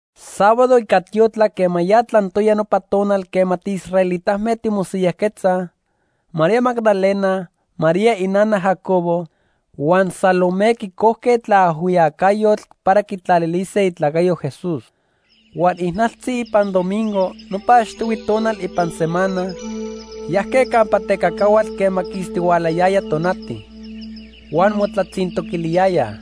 Sábado ica tiotlac quema ya tlantoya nopa tonal quema tiisraelitame timosiyajquetzaj, María Magdalena, María inana Jacobo, huan Salomé quicojque tlaajhuiyacayotl para quitlalilise itlacayo Jesús. Huan ijnaltzi ipan domingo, nopa achtihui tonal ipan semana, yajque campa tecacahuatl quema quistihualayaya tonati. Huan motlatzintoquiliyayaj: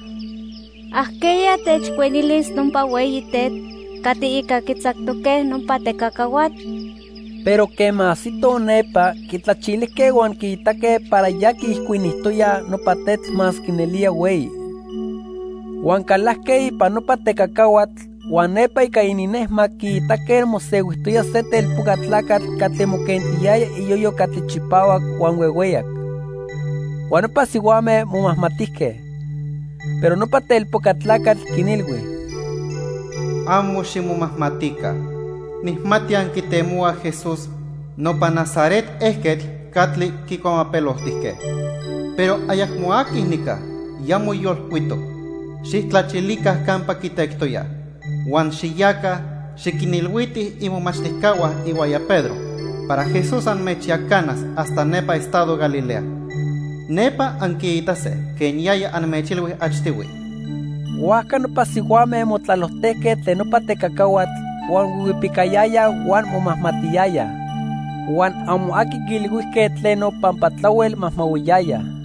—¿Ajqueya techijcuinilis nopa hueyi tetl catli ica quitzactoque nopa tecacahuatl? Pero quema ajsitoj nepa, quitlachilijque huan quiitaque para ya quiijcuinijtoyaj nopa tetl masque nelía hueyi. Huan calajque ipan nopa tecacahuatl, huan nepa ica ininnejmac quiitaque mosehuijtoya se telpoca tlacatl catli moquentiyaya iyoyo catli chipahuac huan huehueyac. Huan nopa sihuame momajmatijque. Pero nopa telpoca tlacatl quinilhui: —Amo ximomajmatica. Nijmati anquitemohuaj Jesús, nopa Nazaret ejquetl catli quicuamapeloltijque. Pero ayacmo aqui nica, ya moyolcuitoc. Xijtlachilica campa quitectoyaj. Huan xiyaca, xiquinilhuitij imomachtijcahua ihuaya Pedro para Jesús anmechyacanas hasta nepa estado Galilea. Nepa anquiitase quen yaya anmechilhui achtihui. Huajca nopa sihuame motlalojtejque tlen nopa tecacahuatl huan huihuipicayayaj huan momajmatiyayaj. Huan amo aqui quiilhuijque tleno pampa tlahuel majmahuiyayaj.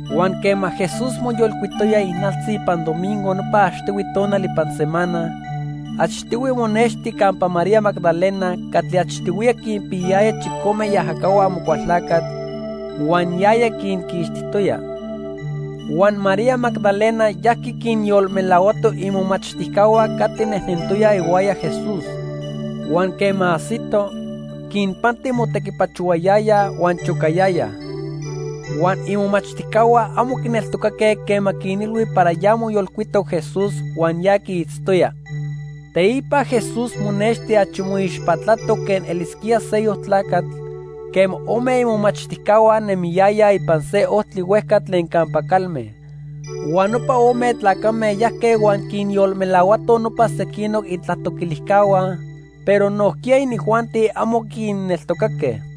Huan quema Jesús moyolcuitoya ijnaltzi ipan domingo nopa achtihui tonal ipan semana, achtihui monexti campa María Magdalena catli achtihuiya quinpiyayaya chicome iajacahua Amocualtlacatl huan yaya quinquixtijtoya. Huan María Magdalena yajqui quinyolmelahuato imomachtijcahua catli nejnentoyaj ihuaya Jesús. Huan quema ajsito, quinpanti motequipachohuayayaj huan chocayayaj. Huan imomachtijcahua amo quineltocaque quema quinilhui para ya moyolcuitoc Jesús huan ya quiitztoya. Teipa Jesús monexti achi moixpatlatoc quen elisquía seyoc tlacatl quema ome imomachtijcahua nemiyayaj ipan se ojtli huejca tlen campa calme. Huan nopa ome tlacame yajque huan quinyolmelahuatoj nopa sequinoc itlatoquilijcahua, pero nojquiya inijuanti amo quinneltocaque.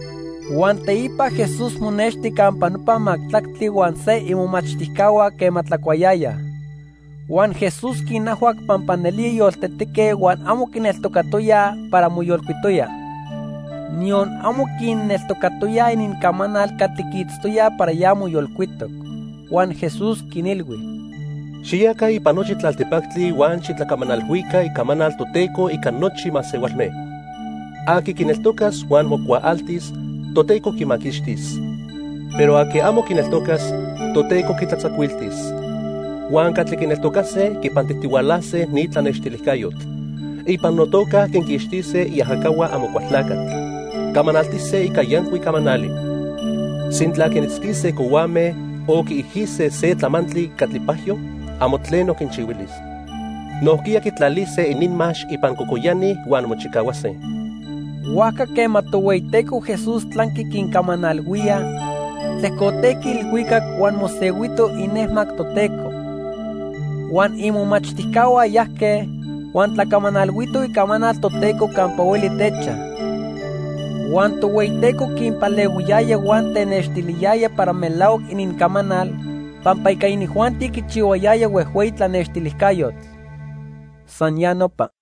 Huan teipa Jesús monexti campa nopa majtlactli huan se imomachtijcahua quema tlacuayayaj. Huan Jesús quinajhuac pampa nelía yoltetique huan amo quineltocatoyaj para moyolcuitoya. Niyon amo quinneltocatoyaj inincamanal catli quiitztoyaj para ya moyolcuitoc. Huan Jesús quinilhui: "Xiyaca ipan nochi tlaltipactli huan xitlacamanalhuica icamanal Toteco ica nochi masehualme. Aqui quineltocas huan mocuaaltis, Toteco quimaquixtis. Pero aqui amo quineltocas, Toteco quitlatzacuiltis. Huan catli quineltocase quipantijtihualase ni tlanextilijcayotl. Ipan notoca quinquixtise iajacahua Amocualtlacatl. Camanaltise ica yancuic camanali. Sintla quinitzquise cohuame o quiijise se tlamantli catli pajyo, amo tleno quinchihuilis. Nojquiya quitlalise ininmax ipan cocoyani huan mochicahuase." Huajca quema Tohueyiteco Jesús tlanqui quincamanalhuía, tlejcotejqui ilhuicac huan mosehuito inejmac Toteco. Huan imomachtijcahua yajque, huan tlacamanalhuitoj icamanal Toteco campa hueli techaj. Huan Tohueyiteco quinpalehuiyaya huan tenextiliyaya para melahuac inincamanal pampa ica inijuanti quichihuayaya huejhueyi tlanextilijcayotl. San ya nopa.